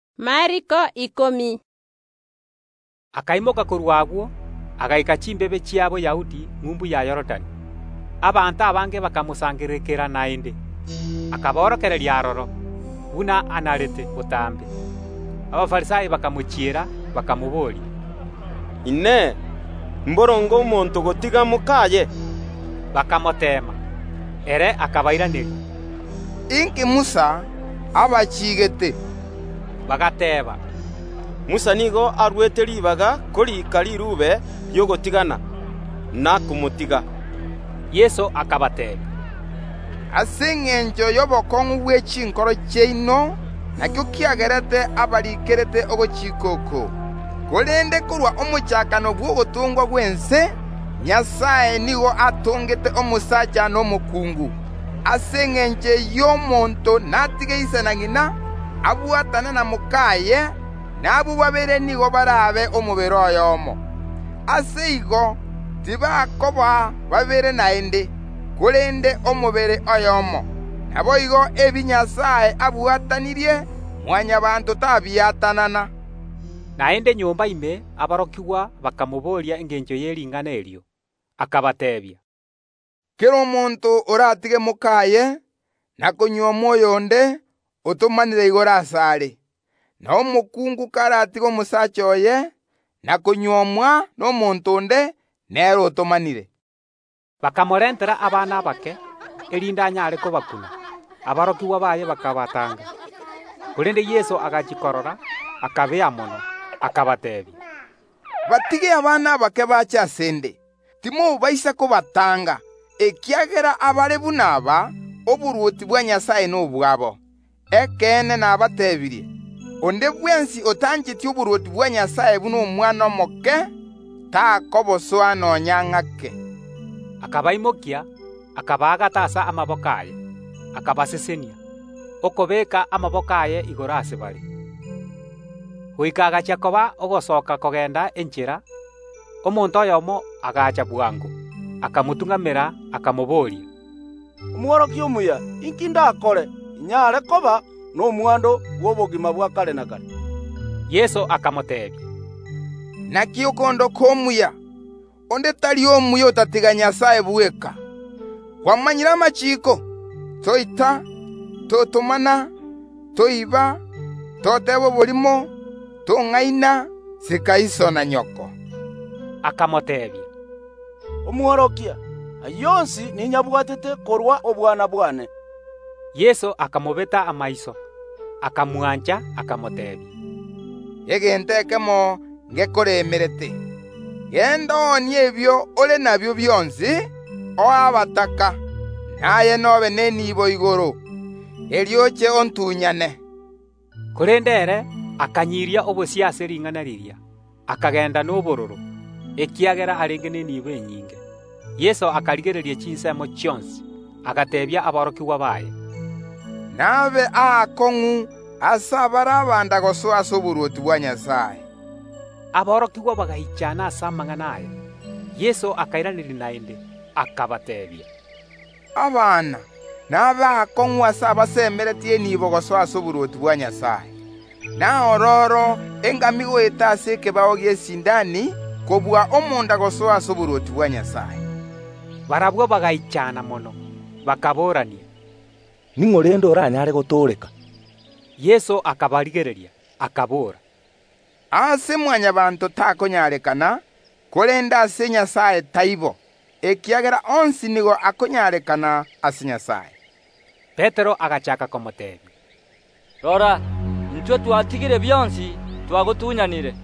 Yeso akaimoka korwa agwo, agaika chimbebe chia Boyahudi, ng’umbu ya Yorodani. Abanto abange bakamosangererekanera naende; akaborokereria aroro, buna anarete botambe. Abafarisai bakamochiera, bakamobooria, “Inee! Mboronge omonto gotiga mok’aye?” Bakamoteema. Ere akabairaneria, “Inki Musa abachiigete?” Bagateeba, “Musa nigo aruete ribaga koriika riruube ri’ogotigana, na komotiga.” Yeso akabateebia, “Ase engencho y’obokong’u bwe chinkoro chiaino nakio kiagerete abariikerete ogochika oko. Korende korwa omochakano bw’ogotongwa gw’ense Nyasae nigo atongete omosacha na omokungu. Ase engencho eyio omonto natige ise na ng’ina, abwatane na mok’aye, na abwo babere nigo barabe omobere oyomo. Ase igo tibakoba babere naende, korende omobere oyomo. Naboigo ebi Nyasae abwatanirie, Mwanyabaanto tabiatanana.” Naende nyomba ime aborokigwa bakabooria Yeso engencho ye ring’ana erio. Akabateebia, “Kera omonto oratige mok’aye, na kunyuoma oyonde, otomanire igoro asare: na omokungu karatige omosacha oye, na konyuomwa nomonto onde, nere otomanire.” Bakamorentera abana abake, erinde anyare kobakuna; aborokigwa baye bakabatanga. Korende Yeso agachia korora, akabea mono, akabateebia, “Batige abana abake bache ase ’nde, timobaisa kobatanga, ekiagera abare buna aba, oborwoti bwa Nyasae nobwabo Ekeene nabateebirie: Onde bwensi otanyoreti oborwoti bwa Nyasae buna omwana omoke, takobosoa nonya ng’ake.” Akabaimokia, akabaagata ase amaboko aye, akabasesenia, okobeeka amaboko aye igoro ase bare. Ekero Yeso achaaka orogendo rwaye kogenda enchera, omonto oyomo agacha bwango, akamotung’amera, akamobooria, “Omworokia omuya, inki ndakore inyare koba nomwando bw’obogima bwa kare na kare?” Yeso akamoteebia, “Inaki okondoka omuya? Onde tari omuya otatiga Nyasae bweka. Kwamanyire amachiiko: toita, totomana, toiba, toteba oborimo, tong’aina, sika iso na nyoko.” Akamoteebia, “Omworokia, ayio onsi ninyabwatete korwa obwana bwane.” Yeso akamobeta amaiso, akamwancha, akamoteebia, “Egento ekemo ngekoremete; genda, oonie ebio ore nabio bionsi, oe abataka, na aye n’obe nenibo igoro; erio oche ontunyane.” Korende ere akanyiria obosio ase ring’ana riria, akagenda n’obororo, ekiagera arenge n’eniibo enyinge. Yeso akarigereria chinsemo chionsi, agateebia aborokigwa baye, “Nabe aakong’u ase abare abanda gosoa ase oborwoti bwa Nyasae.” Aborokigwa bagaichana ase amang’ana aya. Yeso akairaneria naende, akabateebia, “Abana, nabe aakong’u ase abasemeretie enibo gosoa ase oborwoti bwa Nyasae! Naororo engamia goeta ase ekebao gi’esindani kobua omonda gosoa ase oborwoti bwa Nyasae.” Aborokigwa baye bagaichana mono, bakaboorania, “Ning’o rende oranyare gotooreka?” Yeso akabarigereria, akabora, “Ase Mwanyabaanto takonyarekana, korende ase Nyasae taibo, ekiagera onsi nigo akonyarekana ase Nyasae.” Petero agachaaka komoteebia, “Rora, intwe twatigire bionsi, twagotunyanire.”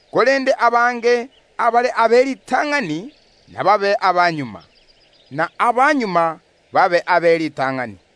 Korende abange abare ab’eritang’ani, ’nababe abamagega; na abamagega babe ab’eritang’ani.”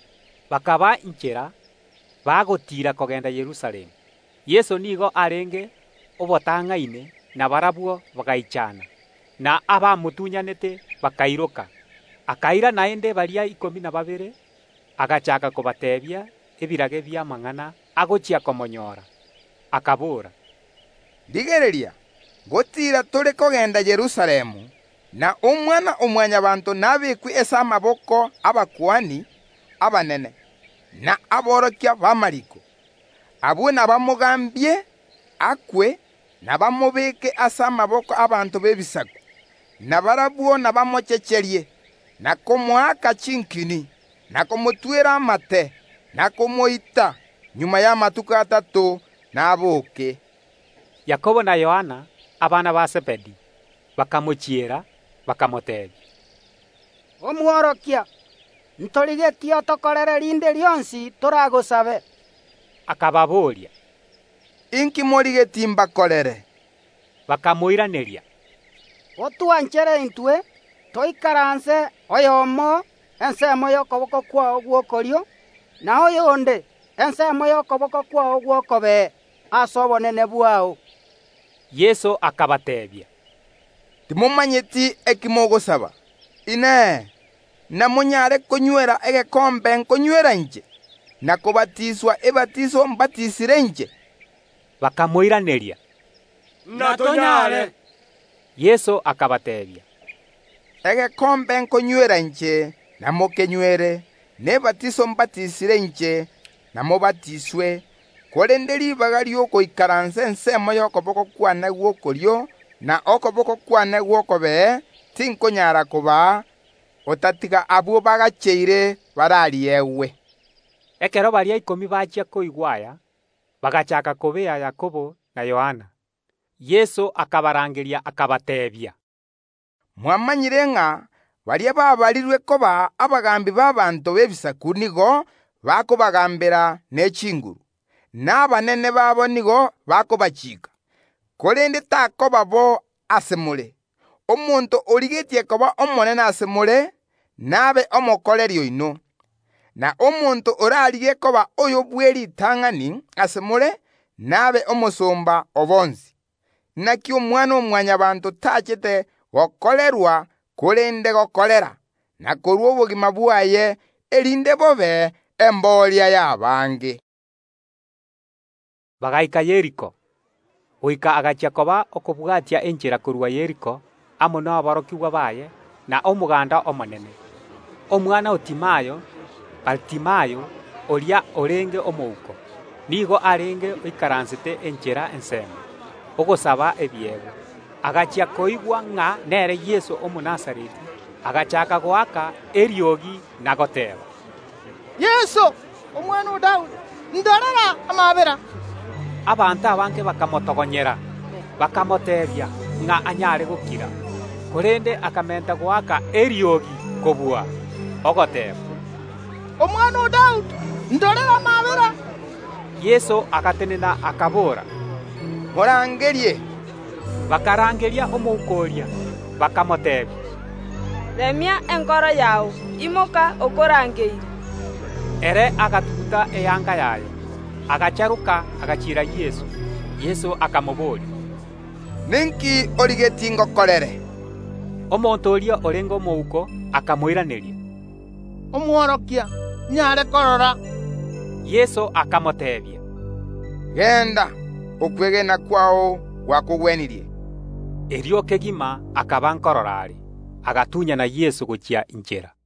Bakaba inchera, bagotiira kogenda Yerusalemu. Yeso nigo arenge obatang’aine, na barabwo bagaichana, na abamotunyanete bakairoka. Naende akaira baria ikomi na babere, agachaaka kobateebia ebirage bi’amang’ana agochia komonyoora, akabora, “Rigereria, ngotiira tore kogenda Yerusalemu, na Omwana-o-Mwanyabaanto nabekwe ase amaboko y’abakuani abanene na aborokia b’amariiko. Abwo nabamogambie, na bamobeke ase amaboko abanto b’Ebisaku, na barabwo nabamochecherie, na komoaka chinkini, na komotwera amate, na komoita akwe; magega y’amatuko atato nabooke.” Yakobo na Yohana, abana ba Zebedi, bakamochiera, bakamoteebia, “Omworokia, ntorigetie otokorere rinde rionsi toragosabe.” Yeso akababoria, “Inki morigetie mbakorere?” Bakamoiraneria, “Otwanchere intwe toikaranse, oyomo ensemo y’okoboko kwao gw’okorio, na oyonde ensemo y’okoboko kwao gw’okobee, ase obonene bwao.” Yeso akabateebia, “Timomanyeti eki mogosaba. Inee! Namonyare konywera egekombe nkonywera inche, na kobatiswa ebatiso inche mbatisire?” Bakamoiraneria, “Ntonyare.” Yeso akabateebia, “Egekombe nkonywera inche imokenywere, na ebatiso ’mbatisire inche imobatiswe, korende ribaga ri’ogoikaransa ensemo y’okoboko kw’ane gw’okorio na okoboko nogw’okobee tinkonyara kobaa, otatiga abwo bagacheire barariegwe.” Ekero baria ikomi bachia koigwa aya, bagachaaka kobea Yakobo na Yohana. Yeso akabarangeria, akabateebia, “Mwamanyire ng’a baria baabarirwe koba abagaambi b’ abanto b’Ebisaku nigo bakobagaambera ne chinguru, na abanene babo nigo bakobachiika. Korende takoba bo ase more. Omonto origetie koba omonene ase more, nabe omokoreri oino. Na omonto orarigie koba oyo bw’eritang’ani ase more, nabe omosomba o bonsi. Inaki Omwana-o-Mwanyabaanto tachete gokorerwa, korende gokorera, na korua obogima bwaye, erinde bobe embooria y’abange.” Bagaika Yeriko. Goika Yeso agachia koba okobwatia enchera korwa Yeriko amo naborokigwa baye na omoganda omonene, omwana o Timayo, Baritimayo, oyio orenge omouko, nigo arenge oikaransete enchera ensemo, ogosaba ebiegwa. Agachia koigwa ng’a Yeso Omonazareti ogoeta, agachaaka goaka eriogi, ogoteeba, “Yeso, omwana o Daudi, indorere amaabera!” Abanto abange bakamotogonyera, bakamoteebia ng’a anyare gokira, korende akamenta goaka eriogi kobua, ogoteeba “Omwana o Daudi, indorera amaabera!” Yeso agatenena, akabora, “Morangerie!” Bakarangeria omouko oria, bakamoteebia, “Remia enkoro yao, imoka, okorangeirie.” Ere agatuguta eanga yaye, agacharoka, agachiera Yeso. Yeso akamobooria, “Ninki origetie ngokorere?” Omonto oria orenge omouko akamoiraneria, “Omworokia, inyare korora.” Yeso akamoteebia, “Genda! Okwegena kwao gwakogwenirie.” Erio kegima akaba nkorora are, agatunyana Yeso kwagachia.